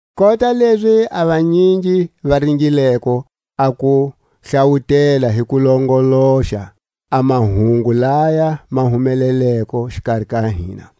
Kota lezi a vanyingi va ringileko a ku hlawutela hi ku longoloxa a mahungu laya ma humeleleko xikari ka hina,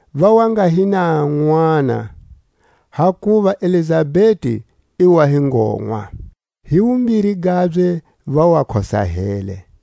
Va wa nga hi na nʼwana, hakuva Elizabeti i wa hi ngonwa, hi wumbiri gabye va wa khosahele.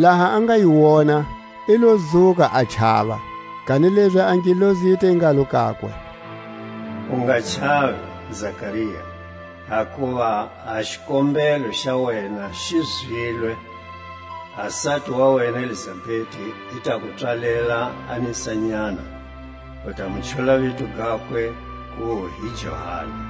laha a nga yi wona i lo dzuka a chava. Kanilezi a ngelosi yi te ngalo kakwe: U nga chavi, Zakaria; hakuva a xikombelo xa wena xi zwilwe; a sati wa wena Elizabeti i ta ku pswalela a nisanyana, u ta mu chula vito gakwe ku hi Johani.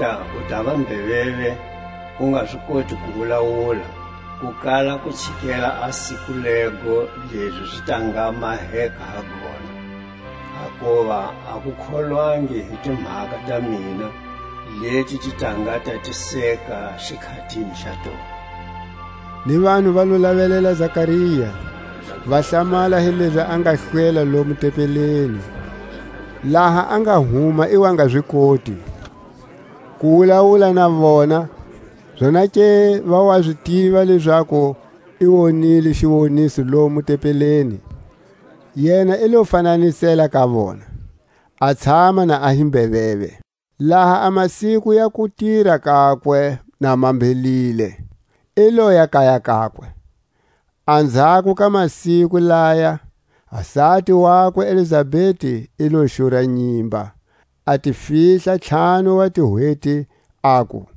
Languta, u tava mbeveve u nga zi koti ku wulawula, ku kala ku chikela a siku lego lezi zi ta nga maheka ha gona, hakuva a ku kholwangi hi timhaka ta mina, leti ti ta nga tatiseka xikhatini xa tona. Ni vanhu va lo lavelela Zakaria, va hlamala hilezi a nga hlwela lomo tempeleni; laha a nga huma i wa nga zi koti ku wulawula na vona; zonake va wa zi tiva lezaku i wonile xiwoniso lomo tempeleni; yena i lo fananisela ka vona, a tshama na hi mbeveve. Laha a masiku ya kutira kakwe na ma mbhelile, i loya kaya kakwe. Anzhako ka masiku laya, a sati wakwe Elizabeti i lo xura nyimba, a ti fihla ntlhanu wa tihweti, aku: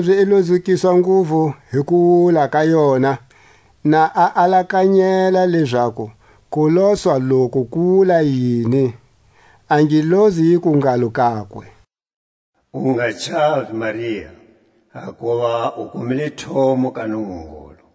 Kanilezi i lo dzukiswa nguvu hi kuwula ka yona, na a alakanyela lezaku kuloswa loku ku wula yini. A ngelosi yiku ngalo kakwe: U nga chavi. Maria; hakuva u kumile thomo ka Nungungulu.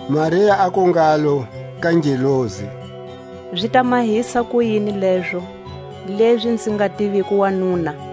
Maria aku ngalo ka ngelosi: Zi ta mahisa kuyini lezo, lezi nzi nga tiviko wanuna?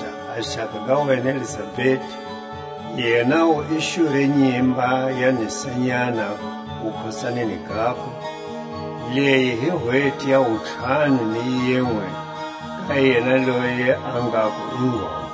Languta, a xaka ga wena Elizabeti, yenawu i xure nyimba ya nisanyana wukhosaneni gakwe; leyi hi hweti ya wuntlhanu ni yinwe ka yena loyi va ngaku i ngonwa.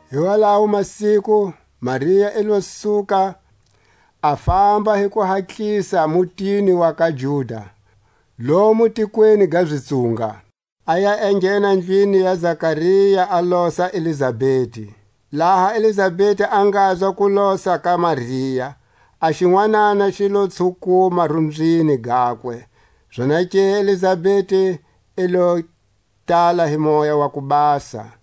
Hi walawo masiku Maria i lo suka a famba hi kuhatlisa mutini wa ka Juda, lomu tikweni ga zitsunga; a ya enghena ndlwini ya Zakaria, a losa Elizabeti. Laha Elizabeti a ngazwa kulosa ka Maria, a xinwanana xi lo tshukuma rumbyini gakwe; zonake Elizabeti i lo tala hi Moya wa ku Basa,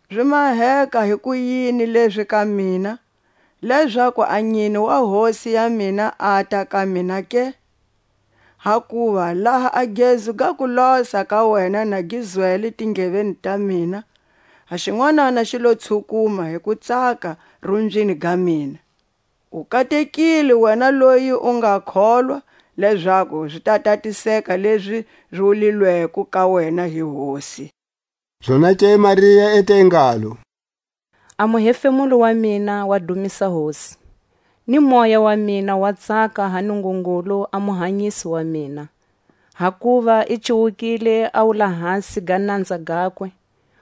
Zi maheka hikuyini lezi ka mina, lezaku a nyine wa Hosi ya mina ata ka mina ke? Hakuva laha a gezu ga kulosa ka wena na gi zwele tindleveni ta mina, a xinwanana xi lo tshukuma hi kutsaka rumbyini ga mina. U katekile wena loyi u nga kholwa, lezaku zi ta tatiseka lezi zi wulawulileko ka wena hi Hosi. Zonake Maria i te ngalo: A muhefemulo wa mina wa dumisa Hosi, Ni moya wa mina wa tsaka ha Nungungulu a Muhanyisi wa mina; Hakuva i cuwukile a wulahasi ga nanza gakwe.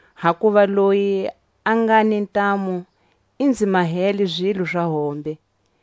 Hakuva Loyi a nga ni ntamu i nzi mahele zilo za hombe;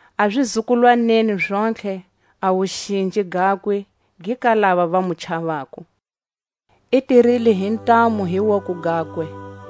A zizukulwaneni zontlhe a wuxinji gakwe gi ka lava va mu chavako. I tirile hi ntamu hi woko gakwe;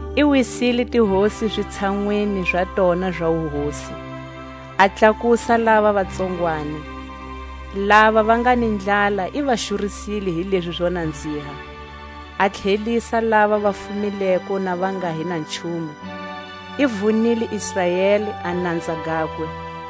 I wisile tihosi zitshanwini za tona za wuhosi, A tlakusa lava va tsongwani. Lava va nga ni ndlala i va xurisile hi lezi zo nanziha; A tlhelisa lava va fumileko na Va nga hi na nchumu. I vunile Israeli a nanza gakwe,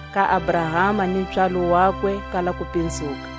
Ka Abrahama ni pswalo wakwe kala kupinzuka,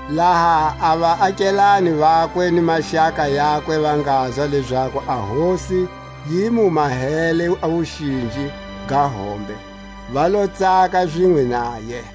Laha a vaakelane vakwe ni maxaka yakwe va ngazwa lezaku a Hosi yi mu mahele a wuxinji ga hombe, va lo tsaka zinwe naye.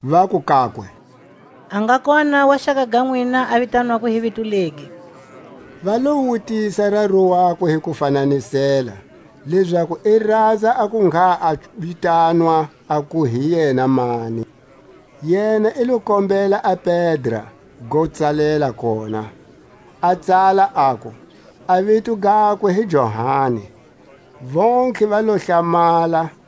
Vaku kakwe: A nga kona wa xaka ga nwina a vitanwako hi vito legi. Va lo wutisa raru wakwe hi ku fananisela, lezaku i ranza a ku ngha a vitanwa aku hi yena mani. Yena i lo kombela a pedra go tsalela kona, a tsala, aku: A vito gakwe hi Johani. Vontlhe va lo hlamala.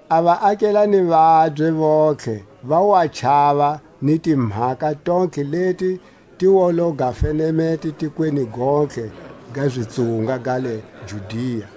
A vaakelane vabye vontlhe va wa chava, ni timhaka tontlhe leti ti wa lo ga fenemete tikweni gontlhe ga zitsunga ga le Judia.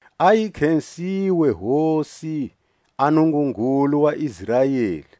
A yi khesiwe Hosi, a Nungungulu wa Israeli,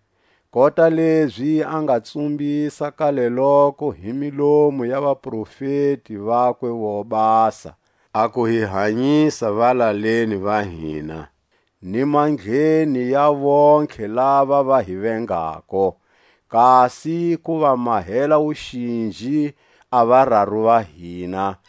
Kota lezi a nga tsumbisa kaleloko hi milomu ya vaprofeti vakwe vo basa, A ku hi hanyisa valaleni va hina, ni mandleni ya vontlhe lava va hi vengako; Kasi ku va mahela wuxinji a vararu va hina,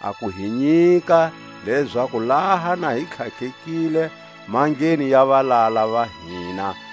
A ku hi nyika lezaku laha na hi tlhatlhekile mandleni ya valala va hina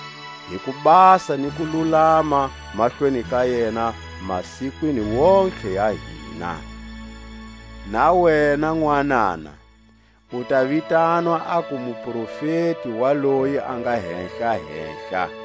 Hi kubasa ni kululama mahlweni ka yena masikwini wontihe ya hina. Na wena nwanana, u ta vitanwa aku muprofeti wa loyi a nga Hehla-Hehla,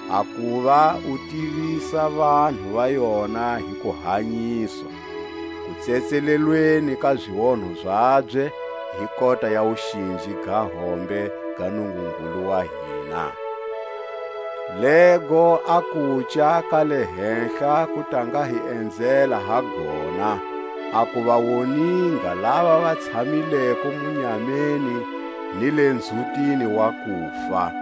A kuva u tivisa vanhu va yona hi kuhanyiswa Kutsetselelweni ka zionho zabye, Hi kota ya wuxinji ga hombe ga Nungungulu wa hina, Lego a kuca ka le hehla ku ta nga hi enzela ha gona, A ku va woninga lava va tshamileko munyameni ni le nzhutini wa kufa,